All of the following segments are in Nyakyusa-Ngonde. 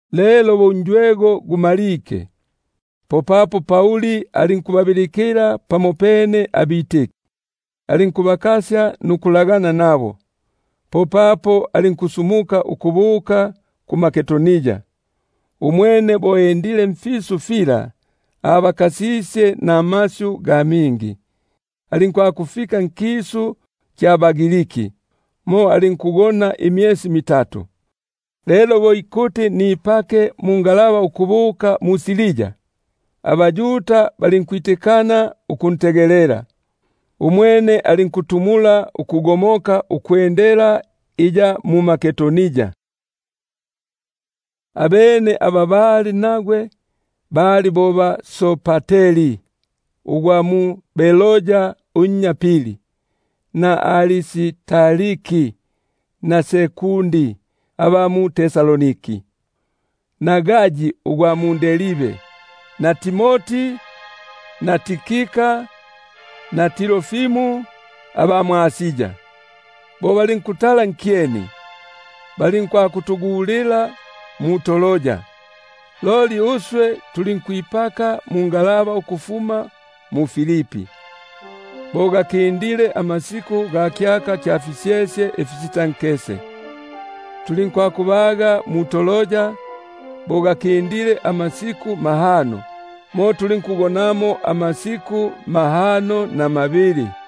Lelo bo unjwego gumalike, popapo Pauli alinkubabilikila abafundigwa, alinkubakasya nukulagana nabo, popapo alinkusumuka ukubuka mMakedonia. Umwene alinkupulungania mfisu fyosa, alinkubakasya namasyu ga mingi, alinkwakufika nkisu kya baGriki; mo alinkugona imyesi mitatu. Lelo bo ikuti nipake mungalaba ukubuka mu-Siria, abaYuda balinkwitikana ukuntegelela; umwene alinkwino- gona ukugomokela iya mMakedonia. Abene aba bali nagwe bali bo ba-Sopateri ugwa mu Beroya unnya Piri, naba-Aristarki na Sekundi aba mu-Tesalonike, na Gayi ugwa mu-Derbe, na Timoti; na Tikika na Trofimo aba mwʼAsia. Bo balinkulongola nkyeni, balinkwakutugulila mu-Troa. Loli uswe tulinkwipaka mungalaba ukufuma mu-Filipi, bo gakindile amasiku ga fisyesye ifisitankese; tulinkwakubaga mu-Troa bo gakindile amasiku mahano, mo tulinkugonamo amasiku mahano na mabili.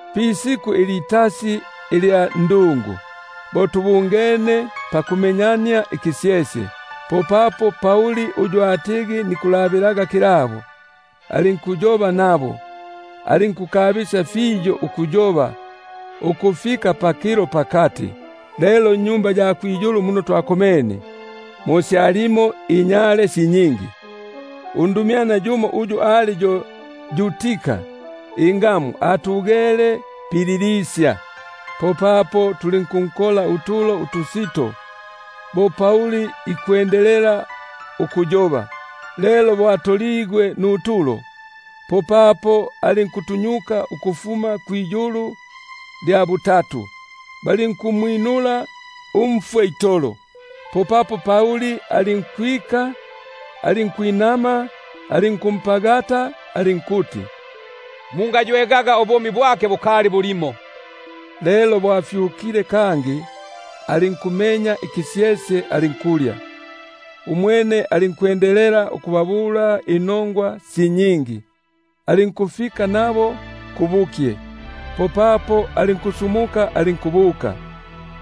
Pisiku ilitasi ilya ndungu, bo tubungene pakumenyania ikisyesye, popapo Pauli uyu atigi nikulabilaga kilabo, alinkuyoba nabo, alinkukabisya fiyo ukuyoba ukufika pakilo pakati. Lelo nnyumba ya kwiyulu muno twakomene, mo syalimo inyale si nyingi. Undumyana yumo uyu ali yo Yutika ingamu, atugele pibwindo.#pibwindo: bamo bikuti pidirisha. Popapo tulinkunkola utulo utusito bo Pauli ikwendelela ukuyoba, lelo bo atoligwe nutulo, popapo alinkutunyuka ukufuma kwiyulu lya butatu; balinku- mwinula umfwe itolo. Popapo Pauli alinkwika, alinkungwilila alinkumpagatila, alinkuti: Mungaywegaga, ubumi bwake bukali bulimo. Lelo bo afyukile kangi, alinkumenya ikisyesye, alinkulya. Umwene alinkubabula si nyingi inongwa, alinku- fika nabo kubukye, popapo alinkusumuka alinkubuka.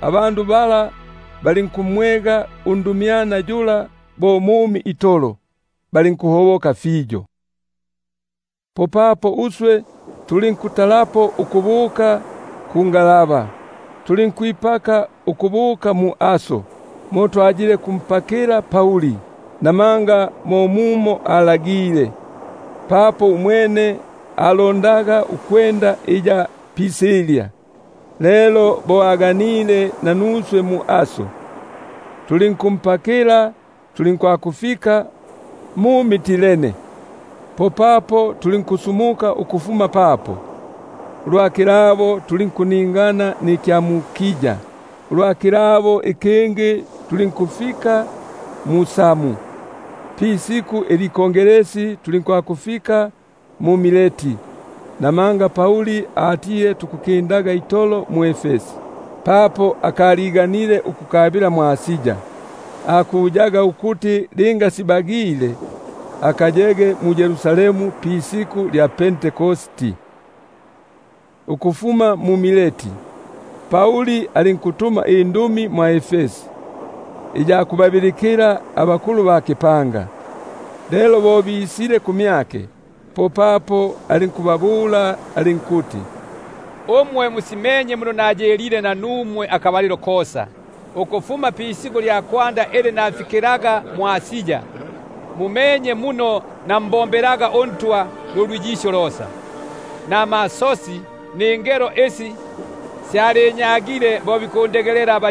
Popapo balinkuntwala undumyana yula umumi itolo; balinkuhoboka fiyo. Popapo tulinkutalapo ukubuka kungalaba, tulinkwipaka ukubuka mwʼAso, mo twatigi tukwakumpakilaga Pauli, namanga mo mumo alagilile, papo umwene alondaga ukwenda iya pisilya. Lelo bo aganile nanuswe mwʼAso, tulinkumpa- kila, tulinkwakufika mu-Mitilene. Popapo tulinkusumuka papo, ulwa kilabo tulinkuningana nikya mu-Kiu; ulwa kilabo ikingi tulinkufika mu-Samu, pisiku ikongesi tulinkwakufika mu-Mileti. Namanga Pauli atile tukukindaga itolo pa Efesi, papo akaliganile ukukabila mwʼAsia; akuyaga ukuti linga sibagile, akayege mu-Yerusalemu pisiku lya Pentekosti. Ukufuma mu-Mileti, alinkutuma indumi mwʼEfesi iya kubabilikila abakulu ba kipanga. Lelo bo bisile kumyake, popapo alinkubabula alinkuti: Umwe musimenye muno nayilile nanumwe akabalilo kosa, ukufuma pisiku lya kwanda ili mfikilege mwʼAsia; nambombelaga uNtwa nulwiyisyo losa, namasosi, ningelo isi syalinyagile bo bikundegelela aba-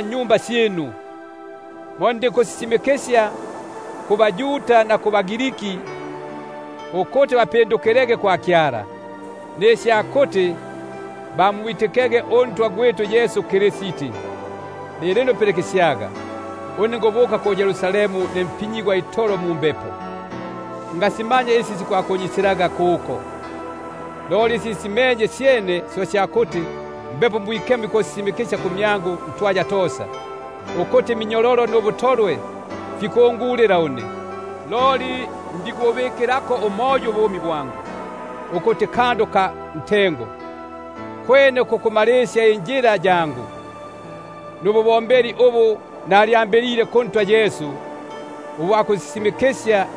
nnyumba syinu; ndinkusisimikisya kubaYuda na kubaGriki isya kupindukila kwa Kyala, nisya kumwitika uNtwa gwitu Yesu Kristi. Keta lelo, nikubuka ku-Yerusalemu ne mpinyigwa itolo mumbepo; ngasimanya nisi sikwakunyisilaga mumo; loli syene si sya kuti Mbepo Mwikemo ikusisimikisya kumyangu ntwaya tosa, ukuti iminyololo nubutolwe fikungu- lila une. Loli ndikububikilako umoyo ubumi bwangu, ukuti kandu ka ntengo, kwene ku kumalisya injila yangu, nububombeli ubu nalyambilile kuNtwa Yesu, ukusisimikisya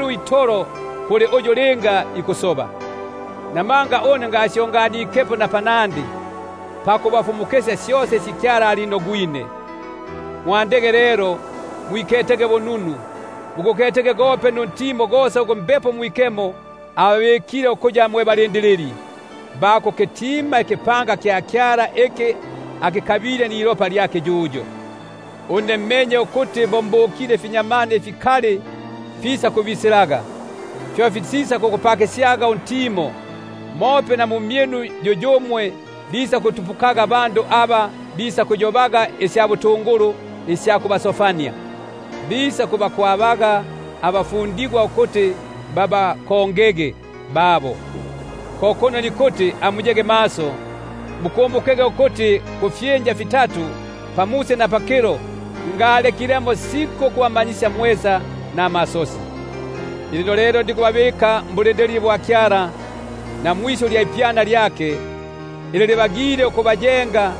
itolo kwilopa lya bosa. Buno ngalyepwikepo pakubafumu- kisya syosa isi Kyala alinogwine. Mwandege lelo, mwiketege bununu, muguketege gope nuntimo gosa ugu Mbepo Mwikemo ababikile ukuya mwe balindilili, ba kukitima ikipanga kya Kyala, iki akikabile nilopa lyake yuyo. Une menye ukuti bo mbukile, bakamutu#bakamutu: bamo bikuti imbumbi. abakali bisakubisilaga, bo batisakugupakisyaga untimo. Mope na mu mmyinu yuyumwe bisakutupukaga abandu aba bisakuyobaga iniongafu, bisakubakwabaga abafundigwa ukuti babakongege babo. Ko kuno nikuti amuyege maso, bo mukukumbuka ukuti kufyinja fitatu, pamusi na pakilo, ngalekilemo siku ukubamanyisya mwesa namasosi. Lilino lelo nikubabika mmaboko ga Kyala, na mwisyu lya ipyana lyake, ili libagile ukubayenga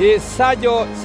nukubapa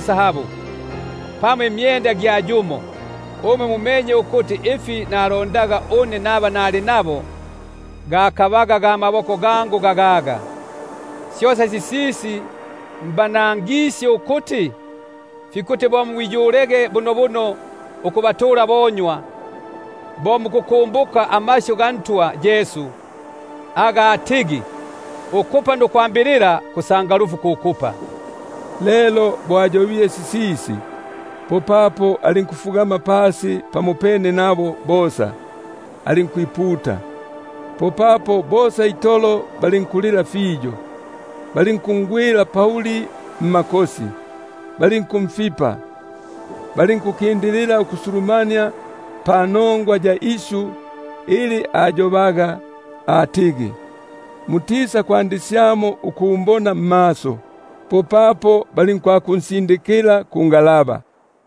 sahabu, pamo imyenda gya yumo. Umwe mumenye ukuti ifi nalondaga une, naba nali nabo, gakabaga ga maboko gangu gagaga. Syosa sisisi mbanangisye ukuti, fikuti bo mwiyulege bunobuno ukubatula abonywa, bo mukukumbuka amasyu ga Ntwa Yesu, apa atigi: Nukupa nukwambilila, kusangalufu ku kupa. Lelo bo ayobile sisisi, popapo alinkufugama pasi pamopene nabo bosa, alinkwiputa. Popapo bosa itolo balinkulila fiyo, balinkungwilila Pauli mmakosi, balinkumfipa. Balinkukindilila ukusulumania panongwa ya isyu ili ayobaga atigi: Mutisakwandisyamo ukumbona mmaso. Popapo balinkwakunsindikila kungalaba.